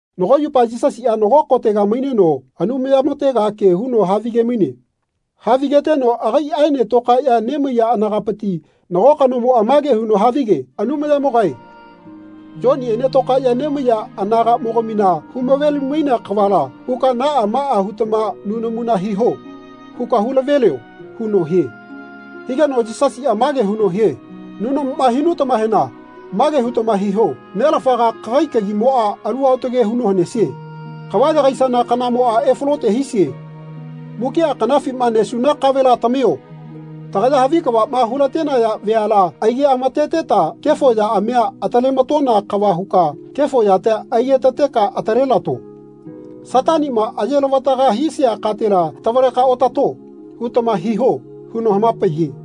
Nago yupa Yisasiꞌa nago kotega maineno Anumaya-motega ke huno havige-maine. Havigeteno agaiꞌaene tokaeno nemaiya anagapiti nago kanomoꞌa mage huno havige “Anumayamogae Yoniꞌene tokaeꞌya nemaiya anagaꞌmogamina humavelimainea kavala huka ‘Naꞌa maꞌa hutama nunamuna hiho.’ huka hulavelio.” huno hie. Higeno Yisasiꞌa mage huno hie “Nunamuma hinutamahena mage hutama hiho ‘Nelafaga kagai kagimoꞌa alu aotage huno hanesie. Kava yagaisana kanamoꞌa efalote hisie. Mukiꞌa kanafima nesuna kavela tamio. Tagaya havi kavaꞌma hulatenaya veala aigeꞌamateteta kefo yaꞌamia atalematona kava huka kefo yatia aigetateka atalelato. Sataniꞌma ayelavataga hisia katela tavaleka otato.’ hutama hiho.” huno hamapaiye.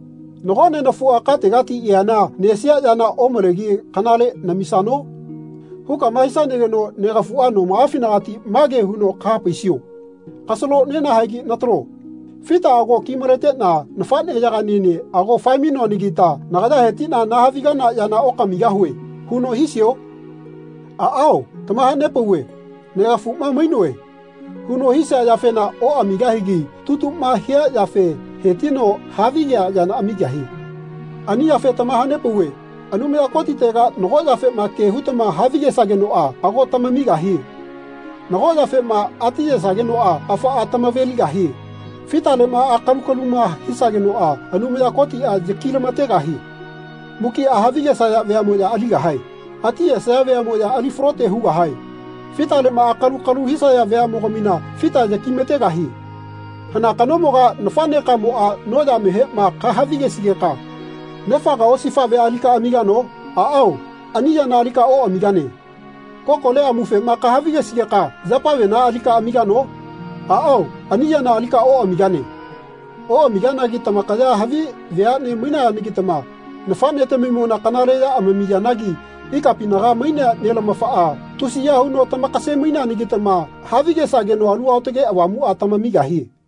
Nago nenafuꞌa kategati eana nesia yana omalegi kanale namisano?’ hukama hisanageno negafuꞌa nomaꞌafinagati make huno kahapaisio ‘Kasalo nenahaegi natalo. Fita ago ki-maleteꞌna nafaꞌneyagaꞌniene ago fae-mainonanagita nagaya hetiꞌna nahavigana yana okamigahue.’ huno hisio? Aꞌao tamahanepauve ‘Negafuꞌma mainoe.’ huno hisia yafena oꞌamigahigi tutuꞌma hia yafe hetino havigea yana amigahie.” Ani yafe tamahanepauve Anumaya Kotitega nago yafema ke hutama havigesagenoꞌa ago tamamigahie. Nago yafema atiyesagenoꞌa afaꞌa tamaveligahie. Fitaleꞌma akalu-kaluma hisagenoꞌa Anumaya Kotiꞌa yakilamategahie. Mukiꞌa havigesaya veaꞌmoya aligahae. Atiyesaya veaꞌmoya ali falote hugahae. Fitaleꞌma akalu-kalu hisaya veaꞌmogamina fita yakimategahie. Hana kanomoga nafaꞌnekamoꞌa noyamehema kahavigesigeka nefaga osifaꞌvea alika amigano? Aꞌao ani yana alika oꞌamigane. Kokole amufema kahavigesigeka yapavena alika amigano? Aꞌao ani yana alika oꞌamigane. Oꞌamiganagi tamakaya havi veaꞌne mainayanagitama nafaꞌnetamimona kanale ya amamiyanagi ikapinaga mainea nelamafaꞌa tusiya huno tamakase-maineanagitama havigesageno Alu Aotage Avamuꞌa tamamigahie.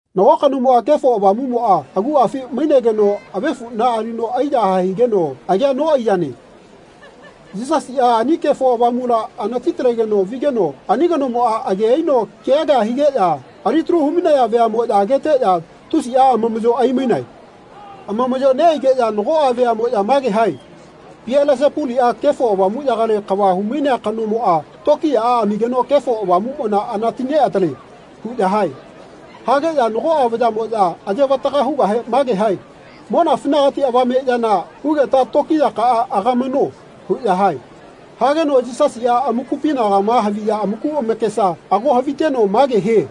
Nago kanomona Kefo Avamuꞌmoꞌa aguꞌafi mainegeno avefuꞌna alino aiyahae higeno agea noꞌaiyane. Yisasiꞌa ani Kefo Avamula anati-talegeno vigeno ani kanomoꞌa age aino kea kea higeꞌya alitalu hu-mainaya veaꞌmoꞌya ageteꞌya tusiꞌa amamaꞌyo aimainae. Amamaꞌyo neꞌaigeꞌya nagoꞌa veaꞌmoꞌya mage hae “Pielesepuliꞌa Kefo Avamuꞌyagale kava hu-mainea kanomoꞌa tokiyaꞌa amigeno Kefo Avamuꞌmona anati-neꞌatalie.” huꞌya hae. Hageꞌya nagoꞌa vayaꞌmoꞌya aye-vataga hugahe mage hae “Monafinagati avame yana hugeta tokiyakaꞌa agamano.” huꞌya hae. Hageno Yisasiꞌa amakupinagama ma haviya amaku amakesa ago haviteno mage hie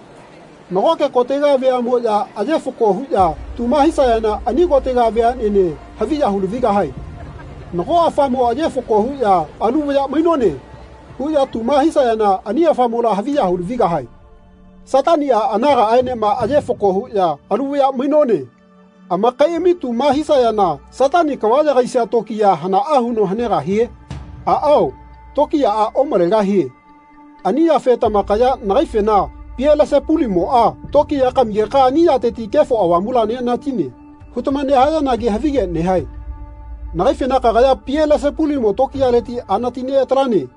“Nagoke kotega veaꞌmoꞌya aye fako huꞌya tuma hisayana ani kotega veaꞌnene haviya hu-lavigahae. Nago afamo aye fako huꞌya ‘Alu vaya mainone.’ huꞌya tuma hisayana ani afamola haviya hu lavigahae. Sataniꞌa anagaꞌaenema aye fako huꞌya ‘Alu vaya mainone.’ amakaiꞌami tuma hisayana Satani kava yagaisia tokiya hanaꞌa huno hanegahie? Aꞌao tokiyaꞌa omalegahie ani yafe tamakaya nagaifena ‘Pielesepulimoꞌa tokiya kamigeka ani yateti Kefo Avamula neꞌanatine.’ hutama nehayanagi havige nehae. Nagaifena ‘Kagaya Pelesepulimo tokiyaleti anati neꞌatalane.’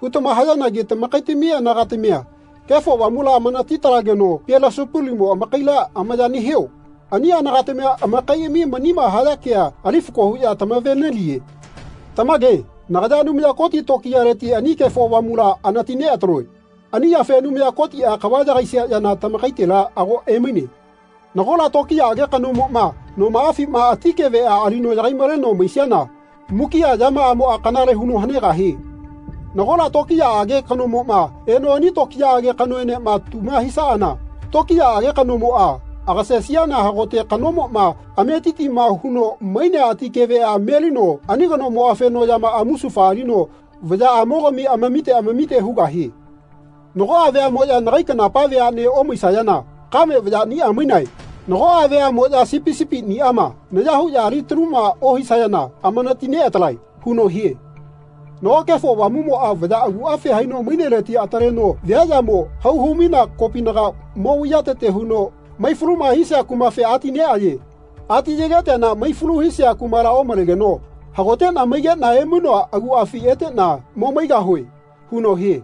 hutama hayanagi tamakaitami anagatamia Kefo Avamula amanati-talageno Pielesepulimo amakaila amaya nehio? Ani anagatamia amakaiꞌami manima haya kea ali fako huꞌya tamaveneliye. Tamage nagaya Anumaya Koti tokiyaleti ani Kefo Avamula anati neꞌataloe. Ani yafe Anumaya Kotiꞌa kava yagaisia yana tamakaitela ago emaine. Nagola tokiyaꞌage kanomoꞌma nomaꞌafima ati keveꞌa alino yagai-maleno maisiana mukiꞌa yamaꞌamoꞌa kanale huno hanegahie. Nagola tokiyaꞌage kanomoma eno ani tokiyaꞌage kanoenema tuma hisaꞌana tokiyaꞌage kanomoꞌa agasesiana hagote kanomoꞌma ametitima huno mainea ati keveꞌa melino ani kanomo afeno yamaꞌa musufa alino vayaꞌamogami amamite amamite hugahie. Nagoꞌa veaꞌmoꞌya nagai kanapa veaꞌne omaisayana kame vayaꞌniꞌa mainae. Nagoꞌa veaꞌmoꞌya sipi sipiꞌniꞌama naya huꞌya ali-taluma ohisayana amanati neꞌatalae.” huno hie. Nago Kefo Avamuꞌmoꞌa vaya aguꞌafi haino maineleti ataleno viaꞌyamo hau hu-mainea kopinaga mo vaiyatete huno mai-faluma hisia kumafe ati neꞌaye. Ati ayegeteana mai-falu hisia kumala omalegeno “Hagoteꞌna maigeꞌna emainoa aguꞌafi eteꞌna mo maigahue.” huno hie.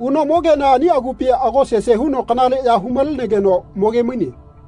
Uno mogeana ani agupi ago sese huno kanaleꞌya hu-malenegeno mogemaine.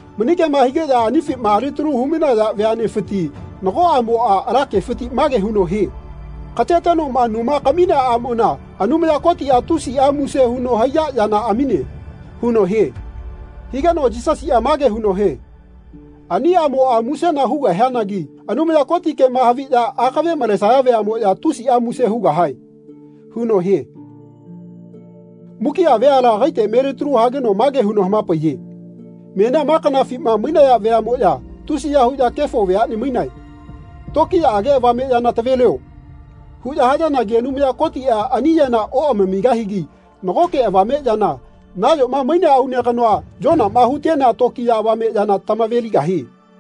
Mani kema higeꞌya anifima alitalu hu-mainaya veaꞌnefiti nago aꞌmoꞌa ala kefiti mage huno hie “Katetenoꞌma numa kaminea aꞌmona Anumaya Kotiꞌa tusiꞌa muse huno haiya yana amine.” huno hie. Higeno Yisasiꞌa mage huno hie “Ani aꞌmoꞌa musena hugahianagi Anumaya Koti kema haviꞌya akave malesaya veaꞌmoꞌya tusiꞌa muse hugahae.” huno hie. Mukiꞌa veala agaite melitalu hageno mage huno hamapaiye “Menia ma kanafima mainaya veaꞌmoꞌya tusiya huꞌya kefo veaꞌne mainae. ‘Tokiyaꞌage avame yana tavelio.’ huꞌya hayanagi Anumaya Kotiꞌa ani yana oꞌamamigahigi nagoke avame yana nayoma mainea aune kanoa Yonama hutenea tokiya avame yana tamaveligahie.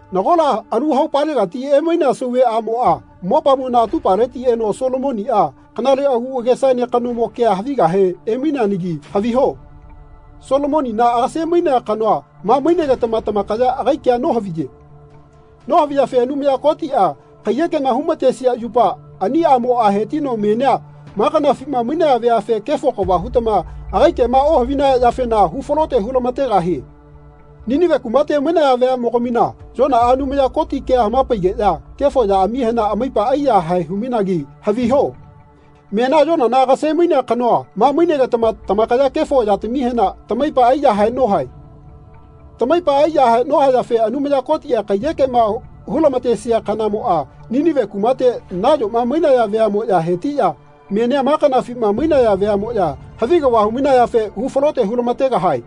Nagola alu haupalegati emainea sauve aꞌmoꞌa mopamona atupaleti eno Solomoniꞌa kanale agu agesaene kanomo kea havigahe emaineanagi haviho Solomonina agase-mainea kanoa ma mainegetama tamakaya agai kea nohaviye. Nohaviyafe Anumaya Kotiꞌa kaiyekema hulamatesia yupa ani aꞌmoꞌa hetino menia ma kanafima mainaya veafe kefo kava hutama agai kema ohavinaya yafena hu falote hulamategahie. Ninive kumate mainaya veaꞌmogamina Yonaꞌa Anumaya Koti kea hamapaigeꞌya kefo yaꞌamihena amaipa aiyahae hu-mainagi haviho menia Yonana agase-mainea kanoa ma mainegetama tamakaya kefo yatamihena tamaipa aiyahae nohae. Tamaipa aiyahae nohayafe Anumaya Kotiꞌa kaiyekema hulamatesia kanamoꞌa Ninive kumate nayoma mainaya veaꞌmoꞌya hetiꞌya menia ma kanafima mainaya veaꞌmoꞌya havi kava hu-mainayafe hu falote hulamategahae.”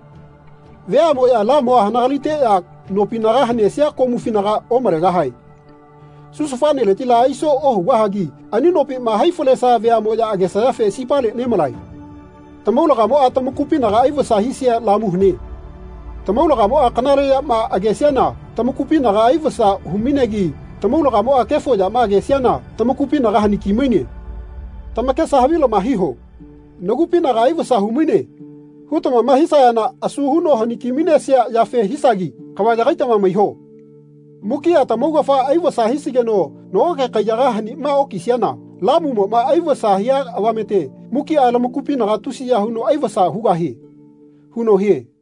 “Veaꞌmoꞌya lamua hanagaliteꞌya nopinaga hanesia komufinaga omalegahae. Susufaneletila aiso ohugahagi ani nopima hai falesaya veaꞌmoꞌya agesayafe sipale nemalae. Tamaulagamoꞌa tamakupinaga aivasa hisia lamu hane. Tamaulagamoꞌa kanale yama agesiana tamakupinaga aivasa hu-mainegi tamaulagamoꞌa kefo yama agesiana tamakupinaga haniki-maine. Tamakesa havilama hiho ‘Nagupinaga aivasa hu-maine.’ hutamama hisayana asu huno haniki-mainesia yafe hisagi kava yagaitama maiho. Mukiꞌa tamaugafa aivasa hisigeno nagoke kaiyaga hanima okisiana lamumoꞌma aivasa hia avamete mukiꞌa lamakupinaga tusiya huno aivasa hugahie.” huno hie.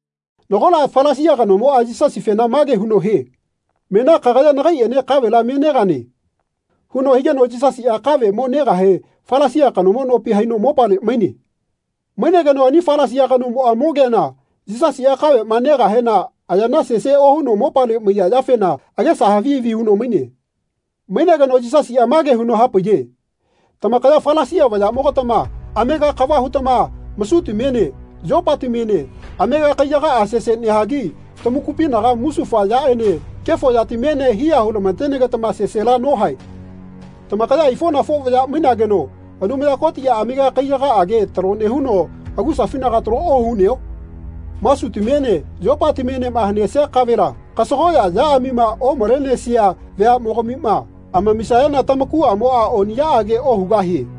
Nagola Falasia kanomoꞌa Yisasifena mage huno hie “Menia kagaya nagaiꞌene kavela me negane.” huno higeno Yisasiꞌa kave mo negahe Falasia kanomo nopi haino mopale maine. Mainegeno ani Falasia kanomoꞌa mogeana Yisasiꞌa kaveꞌma negahena ayana sese ohuno mopale maiya yafena agesa havi havi huno maine. Mainegeno Yisasiꞌa mage huno hapaiye “Tamakaya Falasia vayaꞌmogatama amega kava hutama masutamiene yopatamiene amega kaiyagaꞌa sese nehagi tamakupina musufa yaꞌene kefo yatamiene hiya hulamatenegetama sesela nohae. Tamakaya aifoꞌnafo vaya mainageno Anumaya Kotiꞌa amega kaiyagaꞌage talo nehuno agusafinaga talo ohuneo? Masutamiene yopatamienema hanesia kavela kasagoꞌya yaꞌamima omalenesia veaꞌmogamima amamisayana tamakuꞌamoꞌa oniꞌyaꞌage ohugahie.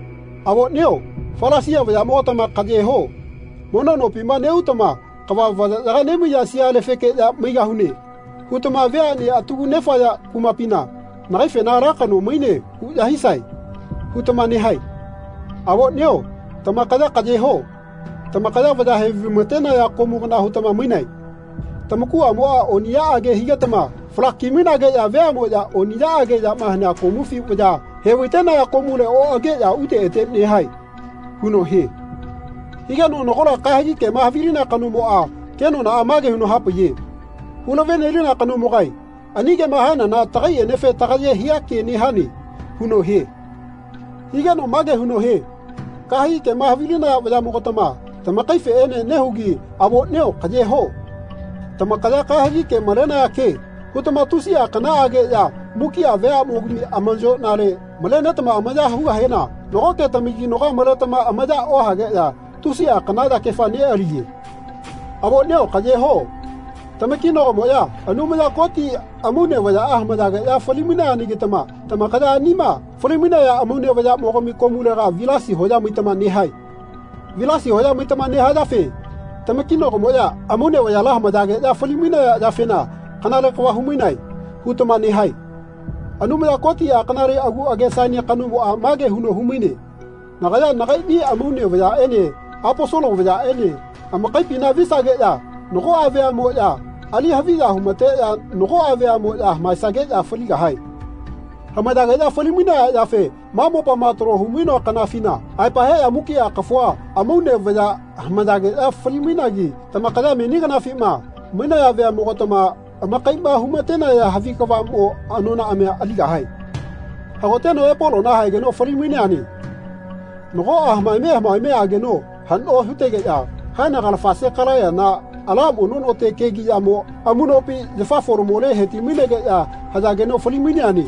Avoꞌnio Falasia vayaꞌmogatama kaꞌyeho. Mono nopima neꞌutama ‘Kava vayayaga nemaiya sialefekeꞌya maigahune.’ hutama veaꞌne atagu nefaya kumapina ‘Nagaifena ala kano mainane huꞌya hisae.’ hutama nehae. Avoꞌnio tamakaya kaꞌyeho. Tamakaya vaya hevaimatenaya komu kana hutama mainae. Tamakuꞌamoꞌa oniꞌyaꞌage higetama falaki-mainageꞌya veaꞌmoꞌya oniꞌyaꞌage yama hanea komufi vaya hevaitenaya komule oꞌageꞌya ute ete nehae.” huno hie. Higeno nagola kahegi kema havilinea kanomoꞌa kenonaꞌa mage huno hapaiye “Hulavenelina kanomogae ani kema hanana tagaiꞌenefe tagaye hia ke nehane.” huno hie. Higeno mage huno hie kahegi kema havilinaya vayaꞌmogatama tamakaifeꞌene nehugi avoꞌnio kaꞌyeho. Tamakaya kahegi ke malenaya ke hutama tusiꞌa kanaꞌage ya mukiꞌa veaꞌmogami amayoꞌnale malenetama amaya hugahena nagoꞌke tamakinagoa maletama amaya ohageꞌya tusiꞌa kana yakefa neꞌaliye. Avoꞌnio kaꞌyeho. Tamakinago-moꞌya Anumaya Koti amaune vayaꞌa hamayageꞌya fali-mainayanagitama tamakaya anima fali-mainaya amaune vayaꞌmogami komulega vilasi hoya maitama nehae. Vilasi hoya maitama nehayafe “Tamakinagomoꞌya amaune vayala hamayageꞌya fali-mainaya yafena kanale kava humainae.” hutama nehae. Anumaya Kotiꞌa kanale agu agesaene kanomoꞌa mage huno humaine “Nagaya nagaiꞌni amaune vayaꞌene Aposolo vayaꞌene amakaipina visageꞌya nagoꞌa veaꞌmoꞌya ali haviya humateꞌya nagoꞌa veaꞌmoꞌya hamaesageꞌya faligahae.” Hamayageꞌya fali-mainaya yafe ma mopama talo hu-mainoa kanafina aepa heꞌya mukiꞌa kafua amaune vaya hamayageꞌya fali-mainagi tamakaya meni kanafima mainaya veaꞌmogatama amakaiꞌma humatenaya havi kavaꞌmo anonaꞌamia aligahae. Hagoteno Epolona haegeno fali-maineane. Nagoꞌa hamaeme hamaeme ageno haꞌno hutegeꞌya haenagalafa Sekalaiyana ala mono no kegiꞌyamo amuꞌnopi yafa folamole heti-mainegeꞌya hayageno fali-maineane.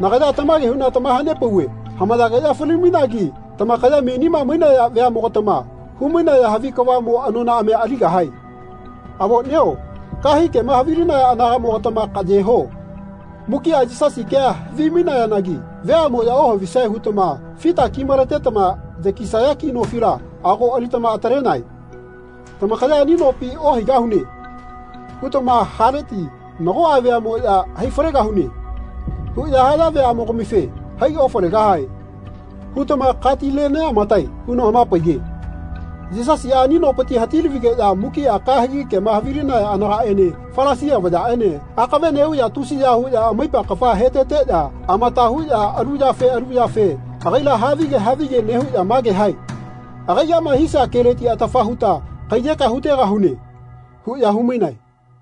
Nagaya tamage huꞌna tamahanepauve hamayageꞌya fali-mainagi tamakaya menima mainaya veaꞌmogatama hu-mainaya havi kavaꞌmo anonaꞌamia aligahae. Avoꞌnio kahegi kema havilinaya anagaꞌmogatama kaꞌye ho. Mukiꞌa Yisasi kea havimainayanagi veaꞌmoꞌya ohavisae hutama fita ki-maletetama yakisaya ki nofila ago alitama atalenae. Tamakaya “Ani nopi ohaigahune.” hutama haleti nagoꞌa veaꞌmoꞌya “Hai falegahune.” huꞌya haya veaꞌmogamife “Hai ofalegahae.” hutama katile neꞌamatae huno hamapaiye. Yisasiꞌa ani nopiti hati-lavigeꞌya mukiꞌa kahegi kema havilinaya anagaꞌene Falasia vayaꞌene akave neꞌuꞌya tusiya huꞌya amaipa kafa heteteꞌya amata huꞌya alu yafe alu yafe agaila havige havige nehuꞌya mage hae “Agaiꞌama hisia keleti atafa huta kaiyekea hutegahune.” huꞌya humainae.